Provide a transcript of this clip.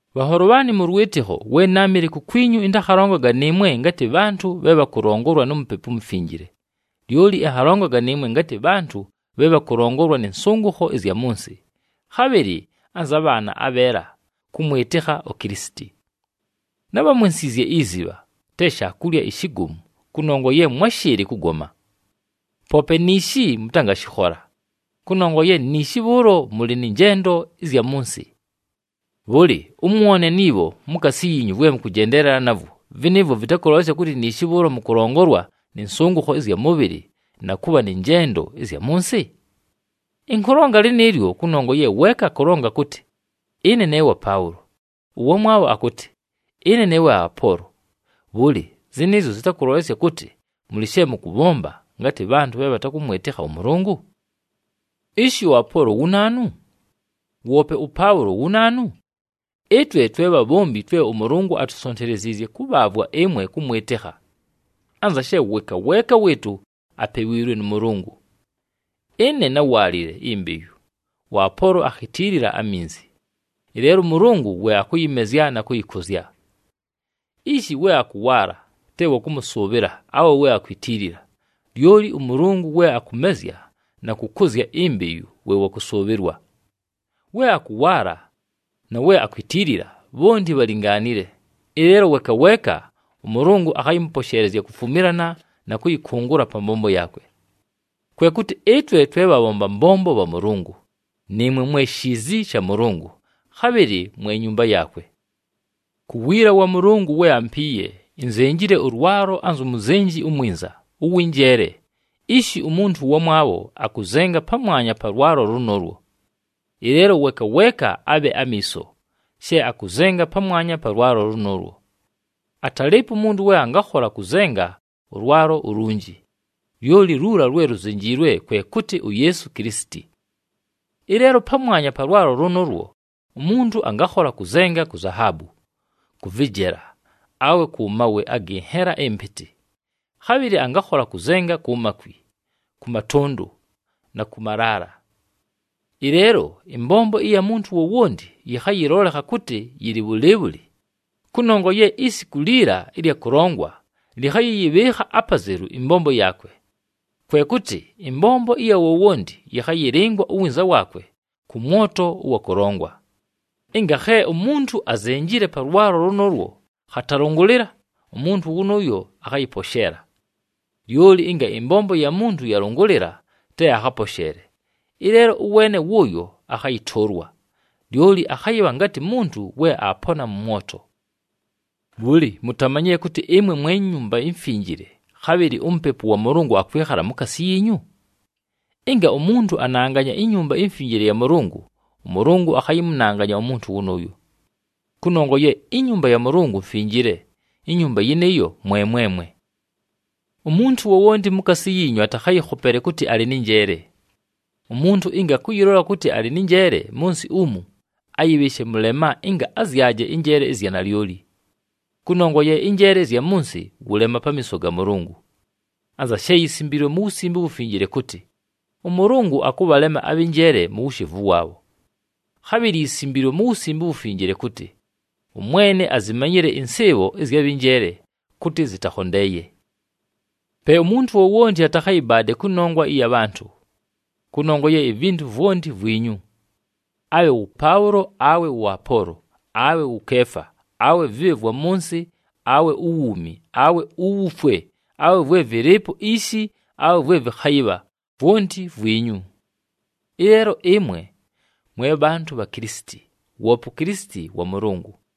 Bhanholo bhaanɨ mʉ lwɨtɨkho, we náamɨle kukwinyu ɨntakhalongaga nɨɨmwe ngatɨ bhantʉ bhe bhakʉlongolwa nu Mupepu uMufinjile, lyoli ɨnhalongaga nɨɨmwe ngatɨ bhantʉ bhe bhakʉlongolwa nɨ nsʉngʉkho ɨzya mʉ nsɨ, khabhɨlɨ anza bhaana abheela kʉmwɨtɨkha uKilisiti. Nábhamwensiizye izibha, te shaakulya ishigomu kʉnongwa ye mwáshɨɨlɨ kʉgoma. Poope niishi mʉtangashɨkhola, kʉnongwa ye niishi bhʉʉlo mʉlɨ nɨ njendo ɨzya mʉ nsɨ. Bhʉlɨ, ʉmwone ni bho mukaasi yiinyu vwe mʉkʉjendeelela navwo, vɨnɨɨvwo vɨtakʉlolesya kʉtɨ niishi bhʉʉlo mʉkʉlongolwa nɨ nsʉngʉkho ɨzya mʉbhɨlɨ na kʉbha nɨ njendo ɨzya mʉ nsɨ? Ɨnkʉlonga lɨnɨɨlyo kʉnongwa ye weeka akʉlonga kʉtɨ, “Ɨne ne wa Paʉlo.” Ʉwamwabho akʉtɨ, “Ɨne ne wa Apoolo.” Bhʉlɨ, zɨnɨɨzyo zɨtakʉlolesya kʉtɨ, mʉlɨ she mʉkʉbhomba ngatɨ bhantʉ bhe bhatakʉmwɨtɨkha ʉMʉlʉngʉ? Ishi ʉApoolo wu naanu? Woope ʉPaʉlo wu naanu? Ɨtwe twe bhabhombi twe ʉMʉlʉngʉ atusonteleziizye kʉbhaavwa ɨmwe kʉmwɨtɨkha. Anza she weeka weeka wɨɨtʉ apewiilwe nʉ Mʉlʉngʉ. Ɨne náwaalile imbeyu, ʉApoolo akhitiilila aminzi, ɨleelo ʉMʉlʉngʉ we akʉyɨmezya na kʉyɨkʉzya. Ishi we akʉwaala te wa kʉmʉsʉʉbhɨla awe we akwitiilila, lyoli ʉMʉlʉngʉ we akʉmezya na kʉkʉzya imbeyu we wa kʉsʉʉbhɨlwa. We akʉwaala na we akwitiilila bhonti bhalingaanile, ɨleelo weeka weeka ʉMʉlʉngʉ akhayɨmʉposheelezya kufumilana na kʉyɨkʉngʉla pa mbombo yaakwe. Kwe kʉtɨ ɨtwe twe bhabhomba mbombo bha Mʉlʉngʉ, nɨɨmwe mwe shiizi sha Mʉlʉngʉ, khabhɨlɨ mwe nyumba yaakwe. Ku wiila wa Mʉlʉngʉ we ampiiye, inzenjile ʉlwalo anzu muzenji umwinza, ʉwɨ njeele, ishi umuntu ʉwamwabho akʉzenga pamwanya pa lwalo lʉnʉʉlwo. Ɨleelo weeka weeka abhe amiiso, she akʉzenga pamwanya pa lwalo lʉnʉʉlwo. Atalɨɨpo umuntu we angakhola kʉzenga ʉlwalo ulunji, lyoli luula lwe luzenjiilwe, kwe kʉtɨ uYeesu Kilisiti. Ɨleelo pamwanya pa lwalo lʉnʉʉlwo, umuntu angakhola kʉzenga ku zahaabu, kʉ vɨjela, awe kʉ mawe agɨ nhela ɨmpɨtɨ, khabhɨlɨ angakhola kʉzenga ku makwi, kʉ matʉndʉ, na kʉ malaala. Ɨleelo ɨmbombo ɨya muntu wowonti yɨkhayɨlolekha kʉtɨ yɨlɨ bhʉlɨɨbhʉlɨ, kʉnongwa ye isiku liila ɨlya kʉlongwa lɨkhayɨyɨbhɨɨkha apazelu ɨmbombo yaakwe. Kwe kʉtɨ ɨmbombo ɨya wowonti yɨkhayɨlɨngwa uwinza waakwe kʉ mwoto ʉwa kʉlongwa. Ɨnga khe umuntu azenjile pa lwalo lʉnʉʉlwo khatalʉngʉlɨla, umuntu wʉnʉʉyo akhayɨposheela. Lyoli ɨnga ɨmbombo ya muntu yalʉngʉlɨla, te akhaposheele, ɨleelo ʉweene wʉʉyo akhayɨtʉʉlwa, lyoli akhayɨbha ngatɨ muntu we aapona mʉ mwoto. Bhʉlɨ, mutamanyile kʉtɨ ɨmwe mwe Nyumba iMfinjile, khabhɨlɨ uMupepu wa Mʉlʉngʉ akwɨkhala mukaasi yiinyu? Ɨnga umuntu ananganya iNyumba iMfinjile ya Mʉlʉngʉ, ʉMʉlʉngʉ akhayɨmʉnanganya umuntu wʉnʉʉyo. Kʉnongwa ye inyumba ya Mʉlʉngʉ mfinjile, inyumba yɨnɨɨyo mwe mwemwe. Umuntu wowonti mukaasi yiinyu atakhayɨkhopele kʉtɨ alɨ nɨ njeele. Umuntu ɨnga akʉyɨlola kʉtɨ alɨ nɨ njeele mʉ nsɨ umu, ayɨbhɨɨshe mʉlema ɨnga azyaje ɨnjeele ɨzya nalyoli. Kʉnongwa ye ɨnjeele ɨzya mʉ nsɨ, wʉlema pamiiso ga Mʉlʉngʉ. Anza she yisimbiilwe mu Wusimbe uWufinjile kʉtɨ, “ɄMʉlʉngʉ akʉbhalema abhɨ njeele mu wushevu waabho.” Khabhɨlɨ yisimbiilwe mu Wusimbe uWufinjile kʉtɨ, “ɄMwene azimanyile ɨnsɨɨbho ɨzya bhɨ njeele kʉtɨ zɨtakhondeeye.” Pe umuntu wowonti atakhayɨbaade kʉnongwa ɨya bhantʉ. Kʉnongwa ye ivintu vwonti vwinyu. Abhe wʉ Paʉlo, awe wʉ Apoolo, awe wʉ Keefa, awe vɨbhe vwa mʉ nsɨ, awe uwuumi, awe uwufwe, awe vwe vɨlɨɨpo ishi, awe vwe vɨkhayɨbha, vwonti vwinyu. Ɨleelo ɨmwe, mwe bhantʉ bha Kilisiti, woope uKilisiti wa Mʉlʉngʉ.